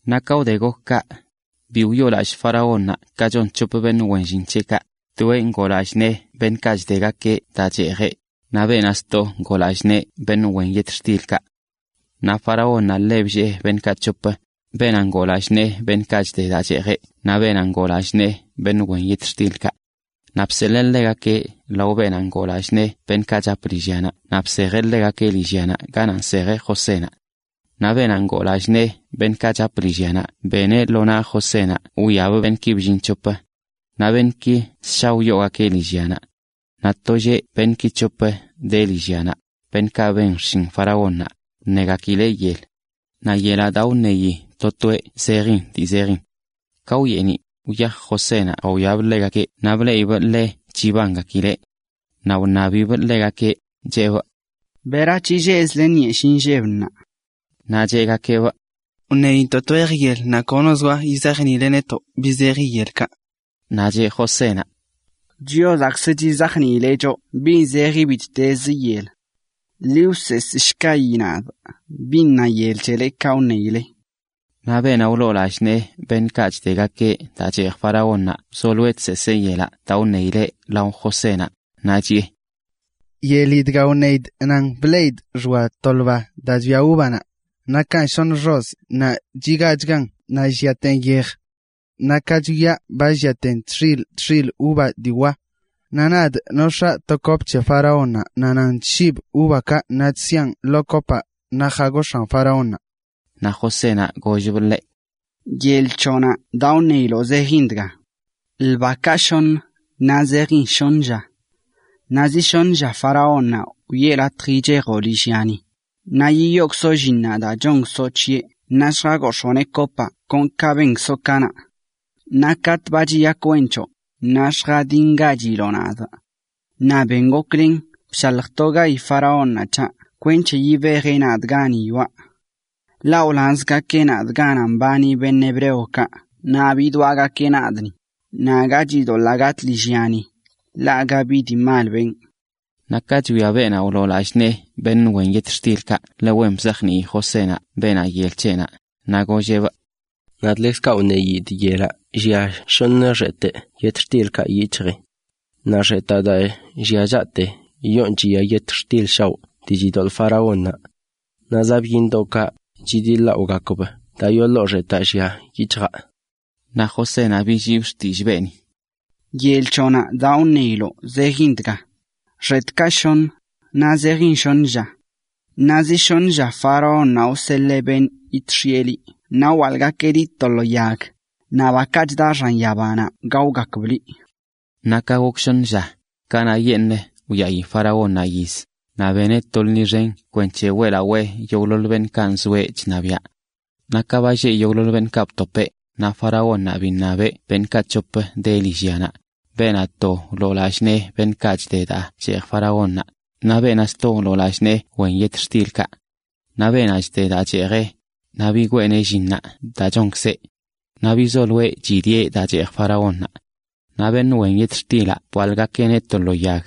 Naꞌ ka wde gok kaꞌ, bi biyoolallꞌ faraónnaꞌ ka chon c̱hop beṉꞌ wen llin c̱heꞌkaꞌ, toeꞌ ngoo lallꞌ nee beṉꞌkaꞌ chdegakeꞌ daa cheejeꞌ, naꞌ beenaꞌ sto ngoo lallꞌ nee beṉꞌ wen yetxtilkaꞌ. Naꞌ faraónnaꞌ ḻe bllee beṉꞌkaꞌ c̱hop, beenaꞌ ngoo lallꞌ nee beṉꞌkaꞌ chde daa cheejeꞌ naꞌ beenaꞌ ngoo lallꞌ nee beṉꞌ wen yetxtilkaꞌ. Naꞌ bseḻee ḻegakeꞌ lao beenaꞌ ngoo lallꞌ nee beṉꞌkaꞌ chap lillyanaꞌ naꞌ bsejeꞌ ḻegakeꞌ lillyanaꞌ ganaꞌ nsejeꞌ Josénaꞌ. Naꞌ beenaꞌ ngoo lallꞌ nee beṉꞌkaꞌ chap lillyanaꞌ beneꞌ lo naꞌ Josénaꞌ wwiabꞌ beṉꞌki bllin c̱hop. Naꞌ beṉꞌki ssha wyoogakeꞌ lillyanaꞌ. Naꞌ to lleꞌ beṉꞌki c̱hop de lillyanaꞌ, beṉꞌkaꞌ ben xshin faraónnaꞌ, wṉegakileꞌ yel. Naꞌ yelaꞌ daa wṉeyi to toeꞌ zejin dii zejin. Ka wyeeniꞌ, wyaj Josénaꞌ jawiabꞌ ḻegakeꞌ naꞌ bleꞌibꞌ ḻe chibangakileꞌ. Naꞌ wṉabibꞌ ḻegakeꞌ, cheꞌbꞌ: ―¿Berac̱he lleꞌzle nyeshiꞌ nlleb ṉaa? Naꞌ cheꞌgakeꞌbꞌ: ―Wṉeyintoꞌ twejə yel naꞌ kono zoa yizajniileꞌ netoꞌ bin zeji yelkaꞌ. Naꞌ cheꞌ Josénaꞌ: ―Chiozaꞌkzə chizajniileꞌ choꞌ bi zejin bittezə yel. Ḻi wseesꞌshkayi nadꞌ bin na yel c̱helekaꞌ wṉeyile. Naꞌ beenaꞌ wloo lallꞌ nee beṉꞌkaꞌ chdegakeꞌ daa cheej faraónnaꞌ wzolo chseesee yelaꞌ daa wṉeyileꞌ lao Josénaꞌ, naꞌ chiꞌe: ―Yeli dga wṉeyidꞌ nan bleꞌidꞌ xoa to ḻba daa chbia uvanaꞌ, nakan shoṉə xozꞌ naꞌ chigaachgan naꞌ lliaten yej. Naꞌ ka chwiaꞌ ba lliaten tx̱iḻ tx̱iḻ uva dii wa. Naꞌ nadꞌ nox̱aa to kop c̱he faraónnaꞌ naꞌ nan chshibꞌ uvakaꞌ naꞌ chsiaꞌn lo kopaꞌ, naꞌ jagox̱aan faraónnaꞌ. Naꞌ Josénaꞌ gollbꞌ ḻeꞌ: ―Yel c̱hoꞌnaꞌ daa wṉeyiloꞌ zejin dga: ḻbakaꞌ shoṉə, naꞌ zejin shoṉə lla. Naꞌ zi shoṉə lla faraónnaꞌ wiꞌe latj yichejoꞌ lillyani, naꞌ yiyookzoꞌ llinnaꞌ daa chonkzoꞌ c̱heꞌ naꞌ lljagox̱ooneꞌ kopaꞌ kon ka benkzoꞌ kanaꞌ. Naꞌ katꞌ ba chiyak wen c̱hoꞌ, naꞌ lljadingachiloꞌ nadꞌ, naꞌ ben goklen bshaljtogayi faraónnaꞌ c̱haꞌ kwenc̱he yibejeꞌ nadꞌ gani yoꞌa. Ḻaꞌ wlanzgakeꞌ nadꞌ ganaꞌ mbani hebreokaꞌ naꞌ bidwaꞌgakeꞌ nadꞌ ni, naꞌ aga chidoḻaa gataa lillya ni, ḻaꞌ aga bi dii mal benꞌ. Naꞌ ka chwia beenaꞌ wloo lallꞌ nee beṉꞌ wen yetxtilkaꞌ ḻe wen bizajnii Josénaꞌ beenaꞌ yel c̱heꞌnaꞌ, naꞌ golleꞌbꞌ: ―Nadꞌ ḻekzkaꞌ wṉeyidꞌ yelaꞌ llia shoṉə xetꞌ yetxtilkaꞌ yic̱hjii. Naꞌ xetaꞌ daa llia chaꞌte yoon chiya yetxtil shaoꞌ dii chidoḻꞌ faraónnaꞌ. Naꞌ zaꞌ byiṉdoꞌkaꞌ chidlaꞌogakb daa yoo ḻoo xetaꞌ llia yic̱hjaa. Naꞌ Josénaꞌ billiibꞌ xtillꞌ beeni: ―Yel c̱hoꞌnaꞌ daa wṉeyiloꞌ zejin dga: Xetꞌkaꞌ shoṉə, naꞌ zejin shoṉə lla. Naꞌ zi shoṉ lla faraónnaꞌ wseḻee beṉꞌ yidx̱iꞌe liꞌ naꞌ wwaḻꞌgakeꞌ liꞌ to lo yag, naꞌ bakaꞌ chda xan yabanaꞌ gaogakb liꞌ. Naꞌ ka gok shoṉə lla, kanaꞌyeṉꞌ wyaꞌi faraónnaꞌ yiz, naꞌ beneꞌ to lṉi xen kwenc̱he weꞌlaweꞌ yogꞌḻoḻ beṉꞌkaꞌ nzoeꞌ chṉabiaꞌ. Naꞌ ka ba lleꞌ yogꞌḻoḻ beṉꞌkaꞌ btopeꞌ, naꞌ faraónnaꞌ biṉabeꞌ beṉꞌkaꞌ c̱hop de lillyanaꞌ, beenaꞌ to wloo lallꞌ nee beṉꞌkaꞌ chde daa cheej faraónnaꞌ, naꞌ beenaꞌ sto wloo lallꞌ nee wen yetxtilkaꞌ. Naꞌ beenaꞌ chde daa cheejeꞌ, naꞌ bigweeneꞌ llinnaꞌ daa chonkzeꞌ. Naꞌ bizoloeꞌ chidieꞌ daa cheej faraónnaꞌ. Naꞌ beṉꞌ wen yetxtilaꞌ bwaḻꞌgakeꞌneꞌ to lo yag.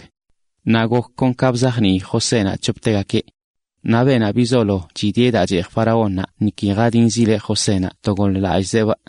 Naꞌ gok kon ka bizajnii Josénaꞌ c̱hoptegakeꞌ. Naꞌ beenaꞌ bizolo chidieꞌ daa cheej faraónnaꞌ niki jadinzileꞌ Josénaꞌ to goḻꞌlallꞌzeꞌbꞌ.